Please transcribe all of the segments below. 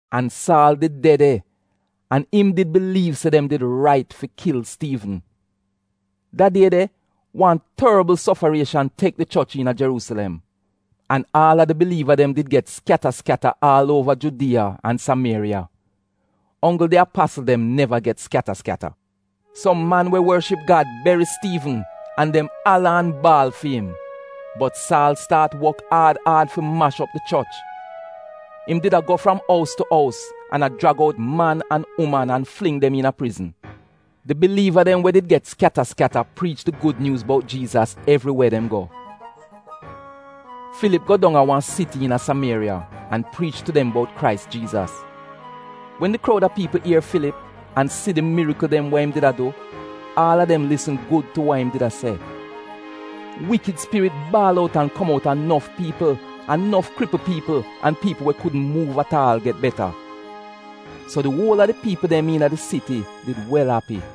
An Saal did de de an im did biliiv se dem did rait fi kil Stiivn. Da die de wan torbl sofarieshan tek di choch iina Jeruusilem. An aal a di biliiva dem did get skyata skyata aal uova Judiya an Samieriya. Onggl di apasl dem neva get skyata skyata. Som man we worship Gad beri Stiivn an dem ala an baal fi im. Bot Saal staat wok aad aad fi mash op di choch. Im did a go fram ous tu ous an a jrag out man an uman an fling dem iina prizn. Di biliiva dem we did get skyata skyata priich di Gud Nyuuz bout Jiizas evriwe dem go. Filip go dong a wan siti iina Samieriya an priich tu dem bout Krais Jiizas. Wen di kroud a piipl ier Filip an si di mirikl dem wa im did a du, aal a dem lisn gud tu wa im did a se. Iivl spirit baal out an kom outa nof piipl an nof kripl piipl an piipl we kudn muuv at aal get beta. So di uol a di piipl dem iina di siti did wel api.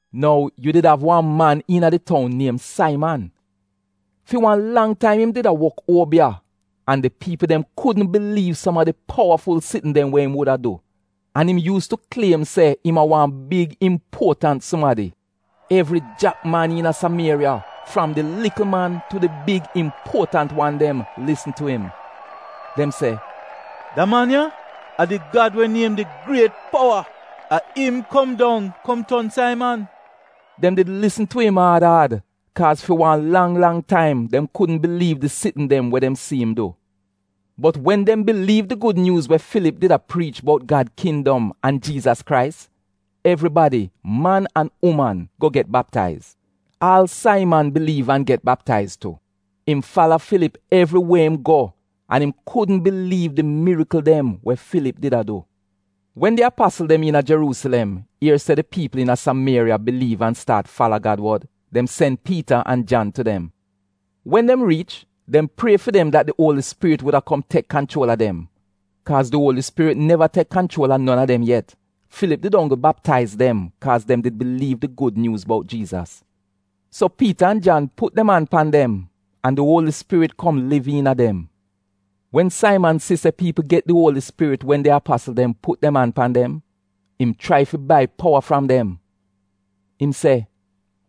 Nou yu did av wan man iina di toun niem Saiman. Fi wan lang taim im did a wok uobiya an di piipl dem kudn biliiv som a di powaful sitn dem we im wuda du. An im yuus tu kliem se im a wan big impuotant sumadi. Evri jak man iina Samieriya, fram di likl man tu di big impuotant wan dem lisn tu im. Dem se “Da man ya a di gad we niem di griet powa. A im kom dong kom ton Saiman.” Dem did lisn tu im aad aad kaaz fi wan lang lang taim dem kudn biliiv di sitn dem we dem si im du. Bot wen dem biliiv di gud nyuuz we Filip did a priich bout Gad kindom an Jiizas Krais, evribadi, man an uman go get baptaiz. Aal Saiman biliiv an get baptaiz tu. Im fala Filip evriwe im go an im kudn biliiv di mirikl dem we Filip did a du. Wen di apasl dem iina Jeruusilem ier se di piipl iina Samieriya biliiv an staat fala Gad wod, dem sen Piita an Jan tu dem. Wen dem riich dem prie fi dem dat di Uoli Spirit wuda kom tek kanchuol a dem. Kaaz di Uoli Spirit neva tek kanchuol a non a dem yet. Filip did onggl baptaiz dem kaaz dem did biliiv di Gud Nyuuz bout Jiizas. So Piita an Jan put dem an pan dem an di Uoli Spirit kom liv iina dem. Wen Saiman si se piipl get di Uoli Spirit wen di apasl dem put dem an pan dem, im chrai fi bai powa fram dem. Im se,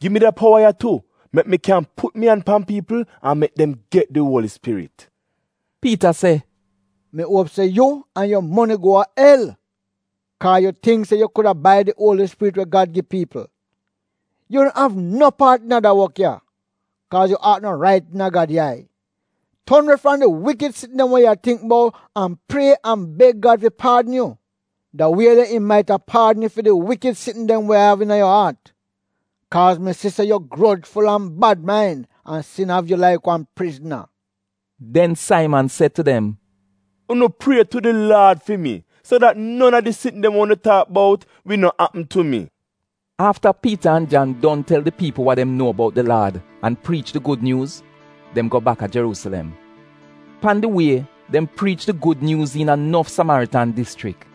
“Gi mi da powa ya tu mek mi kyan put mi an pan piipl an mek dem get di Uoli Spirit.” Piita se, “Mi uop se yu an yu moni go a el kaaz yu tingk se yu kuda bai di Uoli Spirit wa Gad gi piipl! Yu no av no paat iina da wok ya, kaaz yu aat no rait iina Gad yai. Ton we fram di wikid sitn dem we yu a tingk bout an prie an beg Gad fi paadn yu. Da wie de im maita paadn yu fi di wikid sitn dem we yu av iina yu aat Kaaz mi si se yu grojful an bad main an sin av yu laik wan prizna.” Den Saiman se tu dem, “Unu prie tu di Laad fi mi so dat non a di sitn dem we unu taak bout wi no apm tu mi. Afta Piita an Jan don tel di piipl wa dem nuo bout di Laad, an priich di Gud Nyuuz, dem go baka Jeruusilem. Pan di wie dem priich di Gud Nyuuz iina nof Samaritan dischrik.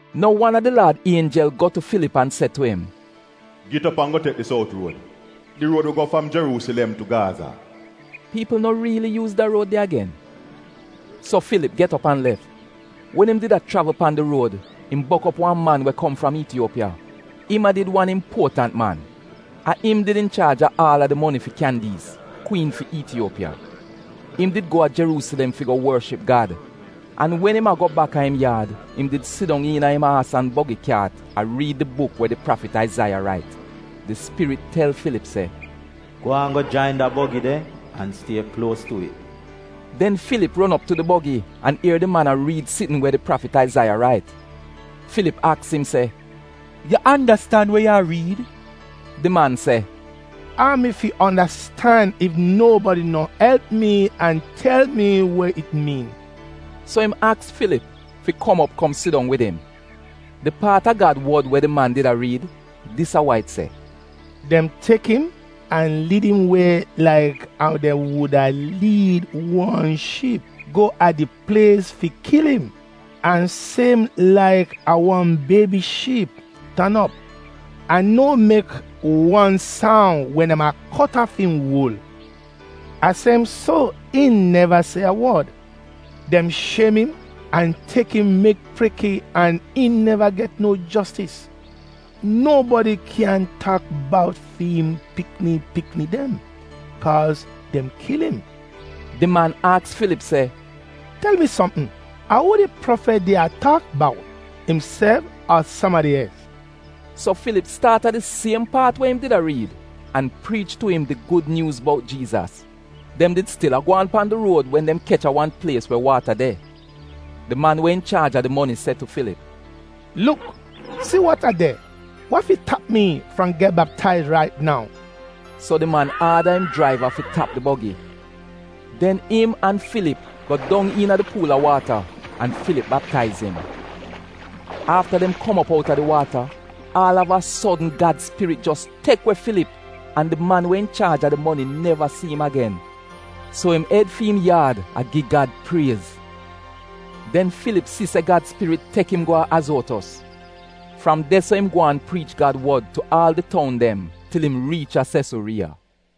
Nou wan a di Laad ienjel go tu Filip an se tu im, “Git op an go tek di sout ruod, di ruod we go fram Jeruusilem tu Gaaza (piipl no riili yuuz da ruod de agen)”. So Filip get op an lef. Wen im did a chravl pan di ruod im bok op wan man we kom fram Iitiyuopiya. Im a did wan impuotant man. A im did inchaaj a aal a di moni fi Kyandiis, kwiin fi Iitiyuopiya. Im did go a Jeruusilem fi go worship Gad an wen im a go bak a im yaad im did sidong iina im aas an bogi a riid di buk we di prafit Aizaiya rait. Di Spirit tel Filip se “Gwaan go jain da bogi de an stie kluos tu it.” Den Filip ron op tu di bogi an ier di man a riid sitn we di prafit Aizaiya rait. Filip aks im se, “Yu andastan wa yu a riid?” Di man se, “Ou mi fi andastan ef nobadi no elp mi an tel mi we it miin?” So im aks Filip fi kom op kom sidong wid im. Di paat a Gad wod we di man did a riid, dis a wa it se: “Dem tek im an liid im we laik ou dem wuda liid wan shiip go a di plies fi kil im, an siem laik ou wan Biebi Shiip tan op an no mek wan soun wen dem a kot aaf im wul, a siem so im neva se a wod. Dem shiem im an tek im mek preke an im neva get no jostis. Nobadi kyan taak bout fi'im pikni pikni dem? Kaaz dem kil im.” Di man aks Filip se, “Tel mi sopm, a uu di prafit did a taak bout, imself ar sumadi els?” So Filip staat a di siem paat we im did a riid an priich tu im di Gud Nyuuz bout Jiizas. Dem did stil a gwaan pan di ruod wen dem kech a wan plies we waata de. Di man we inchaaj a di moni se tu Filip, “Luk! Si waata de! Wa fi tap mi fram get baptaiz rait nou?” So di man aada im jraiva fi tap di bogi. Den im an Filip go dong iina di puul a waata an Filip baptaiz im. Afta dem kom op outa di waata, aal av a sodn Gad Spirit jos tek we Filip an di man we inchaaj a di moni neva si im agen. So im ed fi im yaad a gi Gad priez. Den Filip si se Gad Spirit tek im go a Azotos. Fram de-so im gwaan priich Gad wod tu aal di toun dem til im riich a Sesuriiya.